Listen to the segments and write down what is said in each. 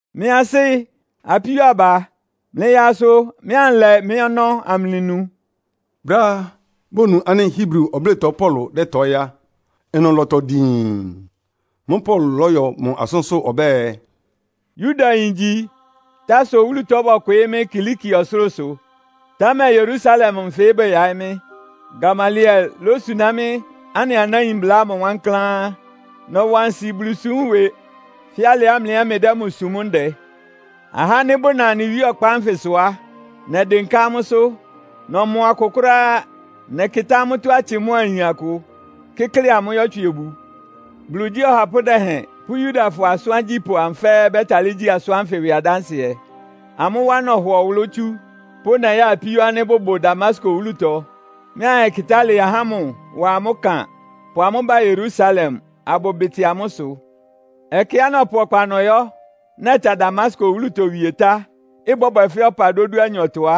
“Mɩ́ asɩ́, apíó aba, mlɩyaa asʋ mɩ́ anlɛ mɩ́ ɔnɔ́ amlɩnu.” Brɛ́á bonu ánɩ́ Hebri ɔblɩ́tɔ Paulo dɛ́tɔɩ́ á, ɩnʋ lɔtɔ diin. Mʋ́ʋ́ Paulo lɔ́yɔ mʋ asʋ́nsʋ́ ɔbɛ́ɛ, “Yudayin ngyi. Tarso wúlutɔ bɔkwɩɩ́ mɩ́ Kilikia ɔsʋlʋ́sʋ, támɛ Yerusalem nfɩ bɛyaɩ́ mɩ́. Gamaliel lósuná mɩ́ anɩ anáin mbla ámʋ wankláán. Nɔwa nsi Bulusúm ɩwɩ fɛ́ alɩá mlɩ ɛ́ mlɩdɛ́ mʋ súm ndɛ. Ahá ánɩ́ bʋna anɩ Wíe ɔkpa ánfɩsʋ á, nɛdɩnká amʋ́sʋ́. Nɔmɔ akʋ kʋ́ráá. Nɛkɩtá amʋ́tɔ́ atsɩ mʋ́a ayin akʋ, kɩ́klɩ amʋ́ yɔ́twsɩ obu. Bulu igyí ɔhapʋ́ dɛhɛn pʋ́ Yudafɔ asʋ́n agyípʋ́ amʋ fɛ́ɛ́ bɛ́talɩ́ gyi asʋ́n ánfɩ ɩwɩ adánsɩɛ. Amʋ́ wá nɔhɔ ɔwʋlʋ́ tsú pʋ́ nɛya apíó ánɩ́ bʋbʋ Damasko wúlutɔ, mɩ́ anyɛkɩtá alɩ ahá ámʋ wa amʋ́ ɩkan, pʋ amʋ́ ba Yerusalem, abʋbɩtɩ amʋ́ ɩsʋ. “Ɛkɛá nɔpʋ ɔkpa nɔyɔ́, nɛta Damasko wúlutɔ wie tá, ɩbɔ́bwɛ fɛ́ ɔpa dódúanyɔtɔ á,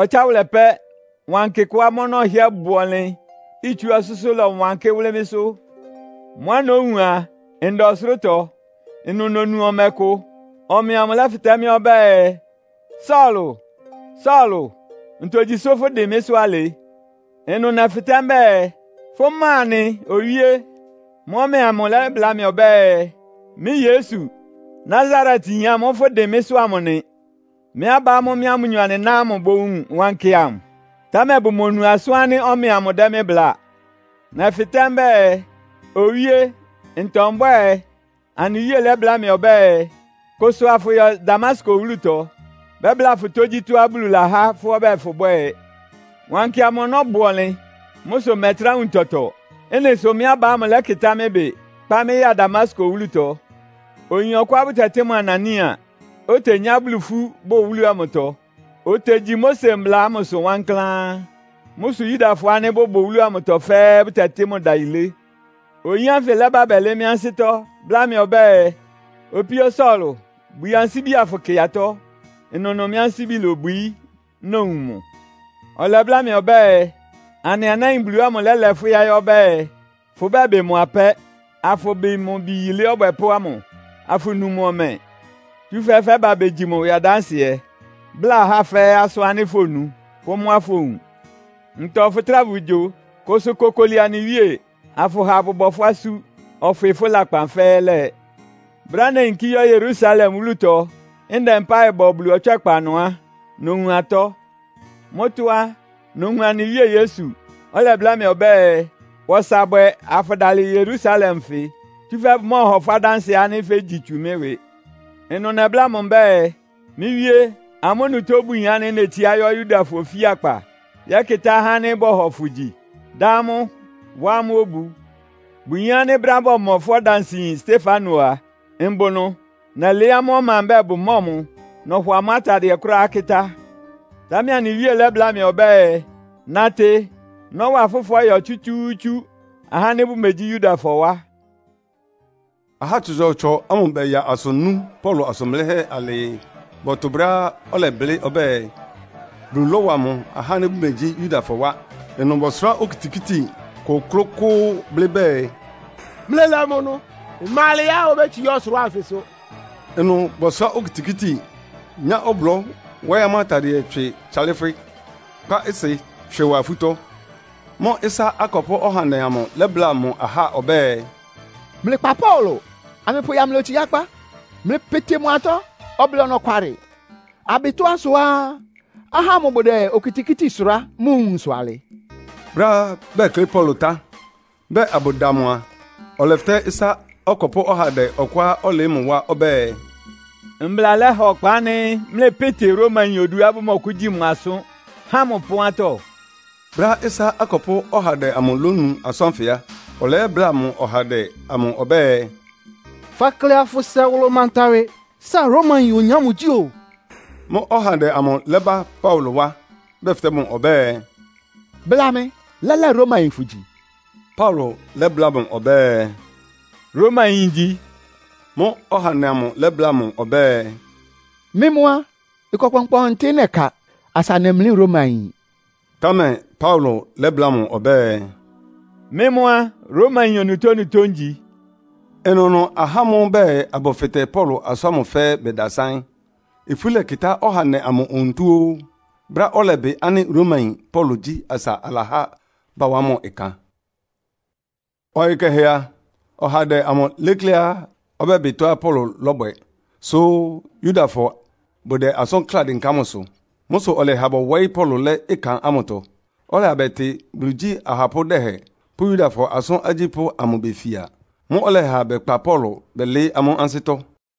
ɔtsáwʋlɛ pɛ́, wankɩ kʋá mʋ́ ɔnɔ́ ɩhɩ́ɛ́ bʋ ɔnlɩn, itsú ɔsʋ́sʋ́ lɔwankɩ́ wʋ́lɩ́ mɩ́sʋ́. Mʋ́á nówun a, nda ɔsʋlʋ́tɔ. Ɩnʋ nonu ɔmɛ kʋ. Ɔmɛ amʋ lɛ́fɩtɛ́ mɩ́ ɔbɛ́ɛ, ‘Saulo, Saulo, ntogyi sʋ́ fʋdɩn mɩ́sʋ́ alɩ?’ Ɩnʋ nɛfɩtɛ́ mbɛ́ɛ, ‘Fʋ́ ma nɩ, Owíé?’ Mʋ́ʋ́ ɔmɛ amʋ lɛ́bláa mɩ ɔbɛ́ɛ, ‘Mɩ́ Yesu, Nasaretyin ámʋ́ʋ́ fʋ́dɩn mɩ́sʋ́ amʋ nɩ.’ Mɩ́ aba ámʋ́ʋ́ mɩ́a amʋ́nyɔ anɩná ámʋ bowun wankɩ amʋ, támɛ bʋmonu asʋ́n ánɩ́ ɔmɛ amʋ dɛ́ mɩ́ bláa. Nɛfɩtɛ́ mbɛ́ɛ, ‘Owíé, ntɔ mbwɛ́ɛ?’ Anɩ Wíe lɛ́bláa mɩ ɔbɛ́ɛ, ‘Kʋsʋ, afʋyɔ Damasko wúlutɔ. Bɛ́bláa fʋ tógyítɔ́á Bulu lahá fʋ́ ɔbɛ́ɛ fʋbwɛ́ɛ.’ Wankɩ amʋ ɔnɔ́ bʋ ɔnlɩn. Mʋ́ sʋ mmɛtrá wun tɔtɔ. Ɩ́nɩ sʋ mɩ́ aba ámʋ lɛ́kɩtá mɩ́ ɩbɩ, kpá mɩ́ ya Damasko wúlutɔ. “Oyin ɔkʋá bʋtɛtɩ́ mʋ Anania, otenyá Bulu ifú bʋ wúlu amʋtɔ. Otegyi Mose mbla ámʋsʋ wankláán. Mʋ́ sʋ Yudafɔ ánɩ́ bʋbʋ wúlu amʋtɔ fɛ́ɛ́ bʋtɛtɩ́ mʋ ɩdayilé. Oyin ánfɩ lɛ́ba bɛlɩɩ́ mɩ́ ansɩ́tɔ́, bláa mɩ ɔbɛ́ɛ, ‘Opíó Saulo, bwii ansíbi afʋkɩ atɔ́.’ Ɩnʋnʋ mɩ́ ansíbi lobwií, nowun mʋ. Ɔlɛbláa mɩ ɔbɛ́ɛ, ‘Anɩ anáin Bulu ámʋ lɛ́lɛ fʋ́ yáɩ́ ɔbɛ́ɛ, fʋbɛ́bɩ mʋ apɛ́, afʋbɩ mʋ Bi Yilé Ɔbwɛpʋ́ ámʋ, afʋnu mʋ ɔmɛ. Tsúfɛ́ fɛ́ba begyi mʋ ɩwɩ adánsɩɛ, bláa ahá fɛ́ɛ́ asʋ́n ánɩ́ fonu pʋ́ mʋ́á fowun. Ntɔ fʋtráa fʋgyo? Kʋsʋ kokoli anɩ Wíe, afʋha abʋbɔ fʋ́ asú, ɔfwɩ fʋ́ lakpan fɛ́ɛ́ lɛ.’ “Brɛ́á neyinkí yɔ́ Yerusalem wúlutɔ ndɛ mpáɩ bɔ Bulu ɔtswɛ́kpa ɩnʋ á, nowun atɔ́. Mʋ́tɔ́ á, nowun anɩ Wíe Yesu, ɔlɛbláa mɩ́ ɔbɛ́ɛ, ‘Wa ɔsa bwɛ, afʋdalɩ Yerusalem nfɩ. Tsúfɛ́ bʋmɔ́ɔhɔ fʋ́ adánsɩɛ ánɩ́ fégyi tsu mɩ́ ɩwɩ.’ Ɩnʋ nɛbláa mʋ mbɛ́ɛ, ‘Mɩ́ Wíe, amʋ́ onutó bʋyin ánɩ́ netsiá yɔ́ Yudafɔ ofíakpa yɛ́kɩtá ahá ánɩ́ bɔhɔ fʋ gyi, dá amʋ́, wá amʋ́ obu. Bʋyin ánɩ́ brɛ́á bɔmɔ fʋ́ ɔdansɩyin Stefano a, mbʋ ɩnʋ. Nɛlɩɩ́ amʋ́ ɔma mbɛ́ɛ bʋmɔ́ɔ mʋ, nɔhɔ ámʋ atadɩɛ kʋ́ráá kɩ́tá.’ Támɛ anɩ Wíe lɛ́bláa mɩ ɔbɛ́ɛ, ‘Natɩ, nɔ́wa fʋ́ fɔ́yɔ tsútsúútsú, ahá ánɩ́ bʋmegyí Yudafɔ wá.’” Ahá tsɔtsɔɔtsɔ amʋ bɛya asʋ nú Paulo asʋn blɩ́hɛ́ alɩɩ bɔtʋ brɛ́á ɔlɛblɩ́ ɔbɛ́ɛ, Bulu lɔ́wa mʋ ahá ánɩ́ bʋmegyí Yudafɔ wá. Ɩnʋ bɔsʋrá okitikíti kʋ́klʋ́kʋ́ʋ́, blɩ́ bɛɛ, “Mlɩlɛ mʋ ɩnʋ! Ɩma alɛá obétsiá ɔsʋlʋ́ʋ anfɩsʋ!” Ɩnʋ bɔsʋrá okitikíti, nyá ɔblɔ́ wɔ́ɩ́ amʋ́ atadɩɛ tswɩ tsalɩ́fwɩ́, kpá ɩsɩ tswɩ wá afútɔ́. Mʋ́ʋ́ ɩsá akɔpʋ́ ɔhandɛ amʋ lɛ́bláa mʋ ahá ɔbɛ́ɛ, “Mlɩkpa Paulo, amlɩpʋ mʋ ya mlɩ otsiákpá. Mlɩpɩtɩ mʋ atɔ́ ɔblɩ ɔnɔkwalɩ, abɩ tɔ́á sʋá ahá ámʋ bʋdɛ okitikíti sʋrá mʋ nwunsʋ alɩ.” Brɛ́á bɛklɩ́ Paulo tá, bɛɛ abʋda mʋ a, ɔlɛfɩtɛ́ ɩsá ɔkɔpʋ́ ɔhandɛ ɔkʋá ɔlɩɩ́ mʋ wá ɔbɛ́ɛ, “Mbla lɛha ɔkpa ánɩ́ mlɩpɩ́tɩ Romayin oduá bʋmɔkʋ́gyi mʋ asʋ́n, há mʋ ɩpɔ́n atɔ́?” Brɛ́á ɩsá akɔpʋ́ ɔhandɛ amʋ lónu asʋ́n ánfɩ á, ɔlɛyɛ́bláa mʋ ɔhandɛ amʋ ɔbɛ́ɛ, “Fakle afʋsɛ wʋlʋ manta ɩwɩ. Sáa Romayin oyin ámʋ gyí oo!” Mʋ́ʋ́ ɔhandɛ amʋ lɛ́ba Paulo wá, bɛfɩtɛ́ mʋ ɔbɛ́ɛ, “Bla mɩ, lɛ́lɛ́ Romayin fʋgyi?” Paulo lɛ́bláa mʋ ɔbɛ́ɛ, “Romayin ngyi.” Mʋ́ʋ́ ɔhandɛ amʋ lɛ́bláa mʋ ɔbɛ́ɛ, “Mɩ́ mʋ́ á, ɩkɔ kpɔnkpɔntɩ nɛka asa nemlí Romayin.” Támɛ Paulo lɛ́bláa mʋ ɔbɛ́ɛ, “Mɩ́ mʋ́ á, Romayin onutónutó ngyi.” Ɩnʋnʋ ahá ámʋ́ʋ́ bɛɛ abʋfɩtɛ Paulo asʋ́n ámʋ fɛ́ɛ́ badásáɩ́n. Ifú lɛkɩtá ɔhandɛ amʋ onutó ó, brɛ́á ɔlɛbɩ ánɩ́ Romayin Paulo gyí asa alahá bawá mʋ ɩkan. Ɔyɩ kɛhɛ a, ɔhandɛ amʋ lékléá ɔbɛ́bɩ tɔ́á Paulo lɔ́bwɛ, sʋ́ Yudafɔ bʋdɛ asʋ́n kláa dɩnká mʋsʋ. Mʋ́ sʋ ɔlɛha bɔwɔɩ́ Paulo lɛ́ ɩkan amʋtɔ, ɔlɛha bɛtɩ Bulu igyí ahapʋ́ dɛhɛn pʋ́ Yudafɔ asʋ́n agyípʋ́ amʋ befia. Mʋ́ʋ́ ɔlɛha bɛkpa Paulo bɛlɩɩ́ amʋ́ ansɩ́tɔ́.